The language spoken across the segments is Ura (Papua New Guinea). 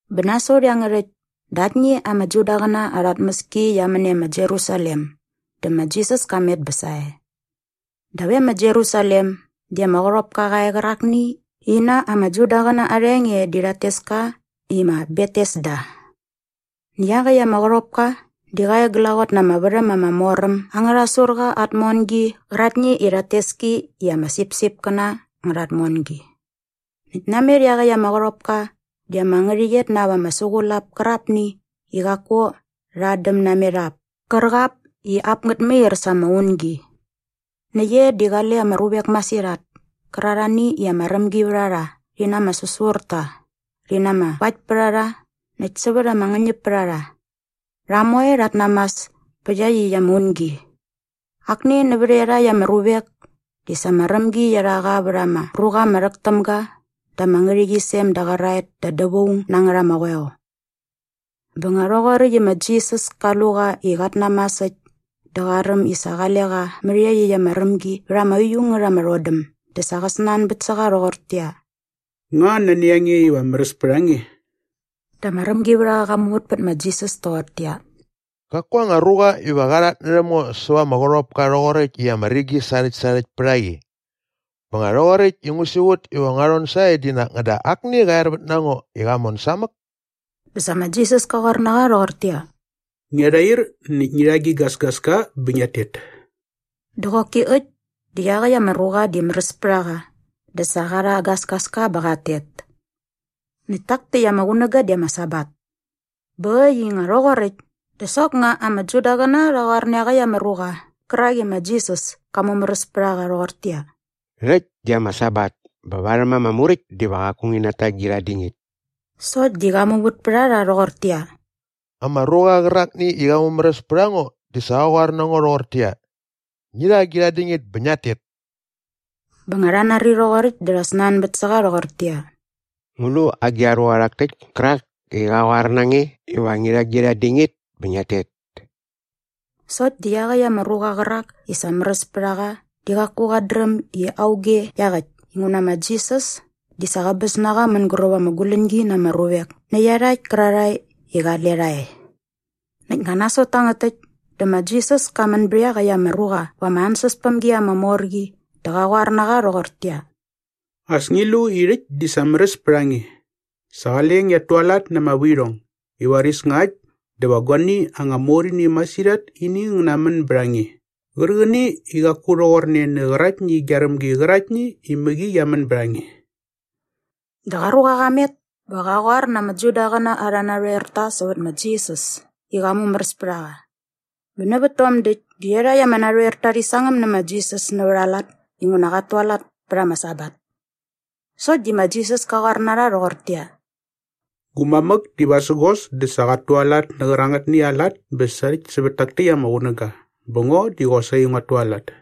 Bä nasot iangärhäkt dä aktni ama Judaqäna arha tmäski qia män e ma Jerusalem dä ma Jisas ka met bä sae. Dap e ma Jerusalem di ama qärhopka qa e qärakni i na ama Judaqäna arha enge di rhat tes ka i ma Betesda. Näkt iaqäkt ama qärhopka di qa e glaqot na ama värhäm ama mor äm angärha surqa aa tmongi qäraktni i rhat tes ki i ama sipsipkäna angärha tmongi. Näkt namet iaqäkt ama qärhopka di ama ngärhäqyet na ap ama suqulap kärqapni i qaku rha adäm namet ap kärqap i ap ngät mair sa ama ungi. Näkt e di qale ama ruvek masirhat kärarhani i ama rämgi vät a rha rhi na ama säsurta rhi na ama vaktpärharha näkt sävät ama ngäñäpärharha. Rha moe rhat namas pä iaqyäkt ama ungi. Akni nävät iarhakt ama ruvek di sa ama rämgi qia rha qa vät ama ruqa ama rhäk täm ga da ama ngärhäqyisem da qäraet da dävaung na ngät ama qoeo. Bä nga rhoqoräkt i ma Jisas ka lu qa i qat namas äkt dä qa räm i sa qale qa mät iaqyäkt ama rämgi vät ama uiu ngät ama rhodäm dä sa qa snanbät sä qa rhoqortäqyia, “Nga nani a nge iva märäs pät a nge?” Dä ama rämgivärhaqa qa muvät pät ma Jisas toqortäqyia, “Qaku anga ruqa iva qa rhatnärhäm ngo säva ama qärhopka rhoqoräkt i ama rigi sarhäktsarhäkt pät a qi. Bä nga rhoqoräkt i ngu siqut iva ngua rhon sae di nak ngäda akni qa er vät na ngo i qa mon samäk.” Dä sa ma Jisas ka qoar na qa rhoqortäqyia, “Ngia rhair näkt ngi rha gi gasgaska bä ngiat tet.” Dä qoki äkt di iaqäkt ama ruqa di märäs pät a qa dä sa qa rha aa gasgaska bä qat tet. Näkt tak täkt ama qunäga di ama Sabat. Bä äkt i nga rhoqoräkt dä soknga ama Judaqäna rha qoar nä iaqäkt ama ruqa qärak i sa ma Jisas ka mumäräs pät a qa rhoqortäqyia, “Rhäkt di ama Sabat bä varhäm ama Muräkt diva qaku ngi nata gi rhatdingit.” Sokt di qa muvät pät a rha rhoqortäqyia, “Ama ruqa qärakni i qa mumäräs pät a ngo di sa qa qoar na ngo rhoqortäqyia, ‘Ngi rha gi rhatdingit bä ngiat tet.’” Bä nga rha nari rhoqoräkt dä rha snanbät sä qa rhoqortäqyia, “Ngu lu agi a ruqa rhak täkt kärak i qa qoar na nge iva ngi rha gi rhatdingit bä ngiat tet?” Sokt di iaqäkt ama ruqa qärak i sa märäs pät a qa di qaku qat dräm i auge iaqäkt inguna ma Jisas di sa qäbäs na qa mänguräp ama guläñgi na ama ruvek nä iarhakt kärarhae i qale rha e. Näkt nga nasot tangät täkt dä ma Jisas ka män bät iaqäkt ama ruqa va ama ansäspämgi ama mor qi dä qa qoar na qa rhoqortäqyia, “As ngi lu i rhäkt di sa märäs pät a nge. Sa qale ngiat tualat na ama vuirhong i varis nga äkt dä va guani anga mor ini masirhat ini ngä namän bät a nge qärqäni i qaku rhoqorne nä qäraktni gia rämgi qäraktni i mäqi qia män bät a nge.” Dä qa ruqa qa met bä qa qoar na ama Judaqäna arhä narhoerta sävät ma Jisas i qa mumäräs pät a qa. Bä nävät tom däkt dä iarhakt ama narhoerta rhi sangäm nä ma Jisas nävät aa lat inguna qat tualat pät ama Sabat. Sokt di ma Jisas ka qoar na rha rhoqortäqyia, “Gu mamäk di vasägos dä sa qat tualat nä qärangätni aa lat bä sarhäkt sävät tak täkt ama qunäga bä ngo di qosaqi nguat tualat.”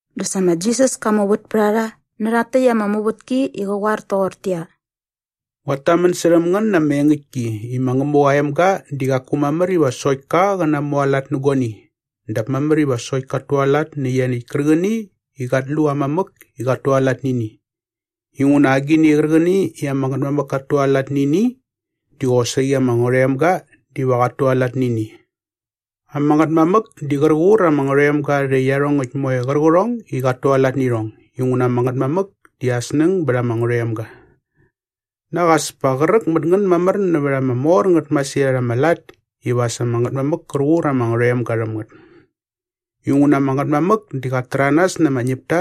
Dä sa ma Jisas ka muvät pät a rha nä rhakt täkt ama muvätki i qä qoar toqortäqyia, “Nguat tamän särhäm ngän na ama engäktki i ma Ngämuqa aa emga di qaku mamär iva sokt ka qä namualat nä guani dap mamär iva sokt kat tualat nä ianiäkt kärqäni i qat lu aa mamäk i qat tualat nä ini. Inguna agini qärqäni i ama Ngätmamäk kat tualat nä ini di qosaqi ama Ngärhoemga diva qat tualat nä ini. Ama Ngätmamäk di qär qur ama Ngärhoemga rhä iarhongäkt moe qärqärhong i qat tualat nä irhong inguna ama Ngätmamäk di aa snäng bät ama Ngärhoemga. Nak as pa qräk mät ngän mamär nävät ama mor ngät masirhat ama lat iva as ama Ngätmamäk kär qur ama Ngärhoemga rhäm ngät. Inguna ama Ngätmamäk di qat täranas na ama ñäpta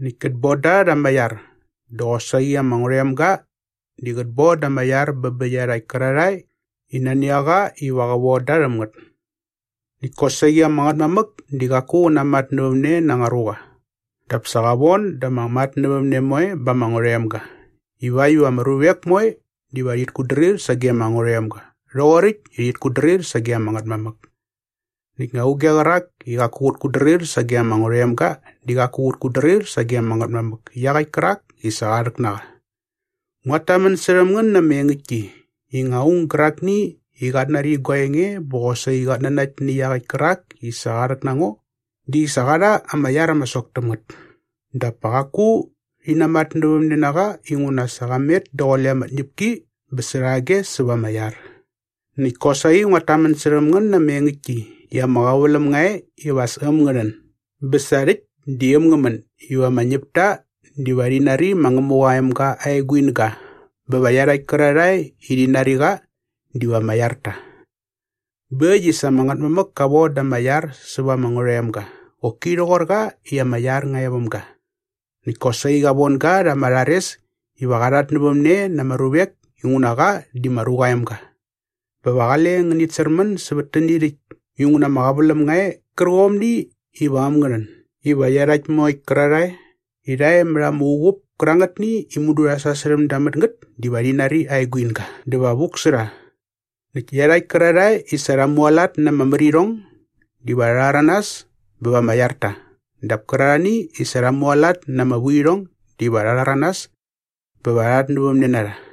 näkt kät bon da rha ama iar dä qosaqi ama Ngärhoemga di qät bon da ama iar bä iarhakt kärarhae i nani a qa iva qä von da rhäm ngät. “Näkt kosaqi ama Ngätmamäk di qaku qä namatnävämne na anga ruqa dap sa qa von da ama matnävämne moe ba ama Ngärhoemga ivakt iva ama ruvek moe diva rhit kutdrir sage ama Ngärhoemga rhoqoräkt i rhit kutdrir sage ama Ngätmamäk. Näkt nga auge qärak i qaku qät kutdrir sage ama Ngärhoemga di qaku qät kutdrir sage ama Ngätmamäk iaqäkt kärak i sa qa rhäk na qa. “Nguat tamän särhäm ngän na ama engäktki i nga aung gärakni i qat nari gua enge bä qosaqi qat nanakt nä iaqäkt kärak i sa qa rhäk na ngo di sa qa rha ama iar ama sok täm ngät dap pa qaku rhi namatnävämne na qa inguna sa qa met daqule ama tñäpki bä särhage säva ama iar. “Näkt kosaqi nguat tamän särhäm ngän na ama engäktki i ama qäväläm nga e iva as äm ngä rhän bä sa rhäkt di äm ngä män iva ama ñäpta diva rhi nari ma Ngämuqa aa emga aa eguinga bä va iarhakt kärarhae i rha nari qa diva ama iar ta. Bä äkt i sa ama Ngätmamäk ka von da ama iar säva ama Ngärhoemga qoki rhoqor qa i ama iar nga e väm ga. Näkt kosaqi qa von ga rha ama rhares iva qa rhatnävämne na ama ruvek inguna qa di ma Ruqa aa Emga. “Bä va qale ngänit särmän sävät täni rhäkt inguna ama qäväläm nga e qärqomni iva äm ngä rhän iva iarhakt moekt kärarhae i rha e mät arha uqup kärangätni i mudu rha sasärhäm da mät ngät diva rhi nari aa eguinga dä va vuk sä rha. Näkt iarhakt kärarhae i sa rha mualat na ama märirhong diva rha rhäranas bä va ama iar ta dap kärarhani i sa rha mualat na ama vuirhong diva rha rhäranas bä va rha rhatnävämne na rha.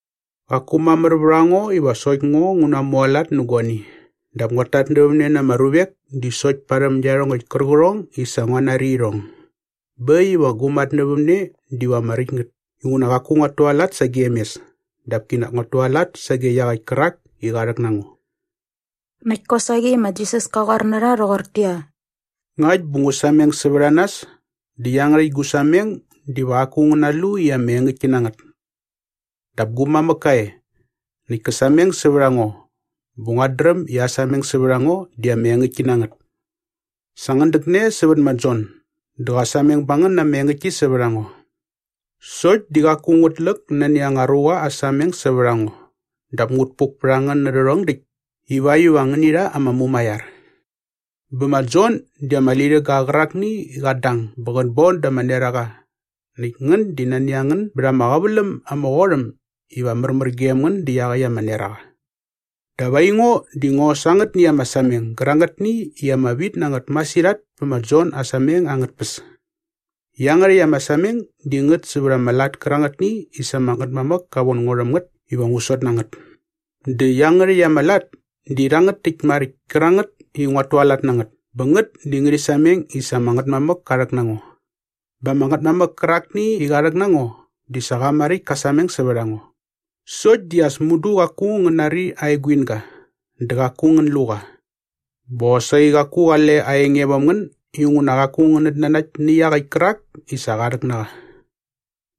“Qaku mamär vät a ngo iva sokt ngo ngu namualat nä guani dap nguat tatnävämne na ama ruvek di sokt parhäm iarhongäkt kärqärhong i sa ngua nari irhong. Bä äkt iva gu matnävämne diva ama räkt ngät inguna qaku nguat tualat sagem mes dap kinak nguat tualat sage iaqäkt kärak i qa rhäk na ngo.” Näkt kosaqi ma Jisas ka qoar na rha rhoqortäqyia, “Ngakt bä ngu sameng sävät a nas dä iangärhäkt gu sameng diva qaku ngä nalu i ama engäktki na ngät. Dap gu mamäk ka e näkt kä sameng sävät a ngo bä nguat dräm i aa sameng sävät a ngo di ama engäktki na ngät. Sa ngän däkne sävät ma Jon dä qa sameng ba ngän na ama engäktki sävät a ngo. Sokt di qaku ngut läk nani anga ruqa aa sameng sävät a ngo dap ngut puk pät a ngän nä rhärhong däkt ivakt iva ngäni rha ama mumaiar. Bä ma Jon di ama lirhäga qärakni i qat dang bä qät bon da ama neraqa näkt ngän di nani a ngän bät ama qäväläm ama qot äm iva märmär gem ngän dä iaqäkt aa neraqa. “Dap aingo di ngo sa angätni ama sameng gärangätni i ama vit na ngät masirhat pä ma Jon aa sameng angät tpäs. Iangärhäkt ama sameng di ngät sävät ama lat kärangätni i sa ama Ngätmamäk ka von ngo rhäm ngät iva ngu sot na ngät. Dä iangärhäkt ama lat di rhangät täkt maräkt kärangät i nguat tualat na ngät bä ngät di ngärhi sameng i sa ama Ngätmamäk ka rhäk na ngo. “Bä ama Ngätmamäk kärakni i qa rhäk na ngo di sa qa maräkt ka sameng sävät a ngo. Sokt di as mudu qaku ngän nari aa eguinga dä qaku ngän lu qa bä qosaqi qaku qale aa enge väm ngän inguna qaku ngänät nanakt nä iaqäkt kärak i sa qa rhäk na qa.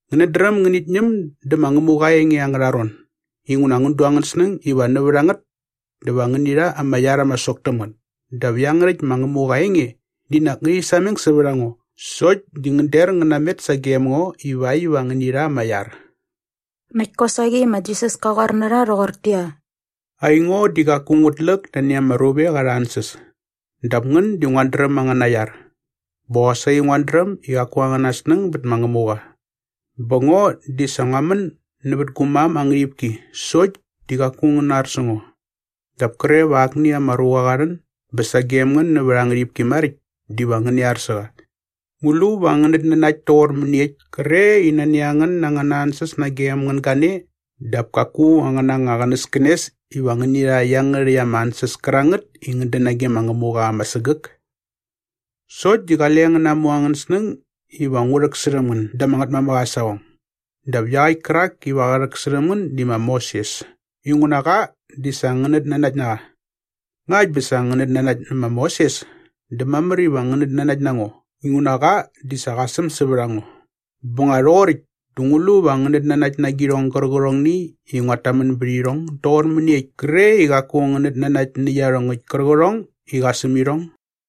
“Ngänät dräm ngänit ñäm dä ma Ngämuqa aa enge angärha ron inguna ngän du angän snäng iva nävät a ngät dä va ngäni rha ama iar ama sok täm ngät dap iangärhäkt ma Ngämuqa aa enge di nak ngärhi sameng sävät a ngo sokt di ngän der ngän namet sagem ngo ivakt iva ngäni rha ama iar.” Näkt kosaqi ma Jisas ka qoar na rha rhoqortäqyia, “Aingo di qaku ngut läk nani ama ruvek arha ansäs dap ngän di nguat dräm angäna iar. Bä qosaqi nguat dräm i qaku angän snäng bät ma Ngämuqa. Bä ngo di sa ngua män nävät gu mam aa ngärhipki sokt di qaku ngän nar sä ngo. Dap kre va akni anga ruqa qa rhän bä sagem ngän nävät aa ngärhipki maräkt diva ngäni ar sä qa. Ngu lu va ngänät nanakt toqor mäniekt kre i nani a ngän na angäna ansäs nagem ngän gane dap kaku angän anga qänäskänes iva ngäni rha iangärhäkt ama ansäs kärangät i ngät dän nage ma Ngämuqa ama sägäk? “Sokt di qale ngän namu angän snäng iva ngu rhäksärhäm ngän da ama Ngätmamäk aa saqong. Dap iaqäkt kärak iva qä rhäksärhäm ngän di ma Moses inguna qa di sa ngänät nanakt na qa. Ngakt bä sa ngänät nanakt nä ma Moses dä mamär iva ngänät nanakt na ngo inguna qa di sa qa säm sävät a ngo. Bä nga rhoqoräkt dä ngu lu va ngänät nanakt na agirhong gärqärhongni i nguat tamän bät irhong doqor mäniekt kre i qaku ngänät nanakt nä iarhongäkt kärqärhong i qa säm irhong?”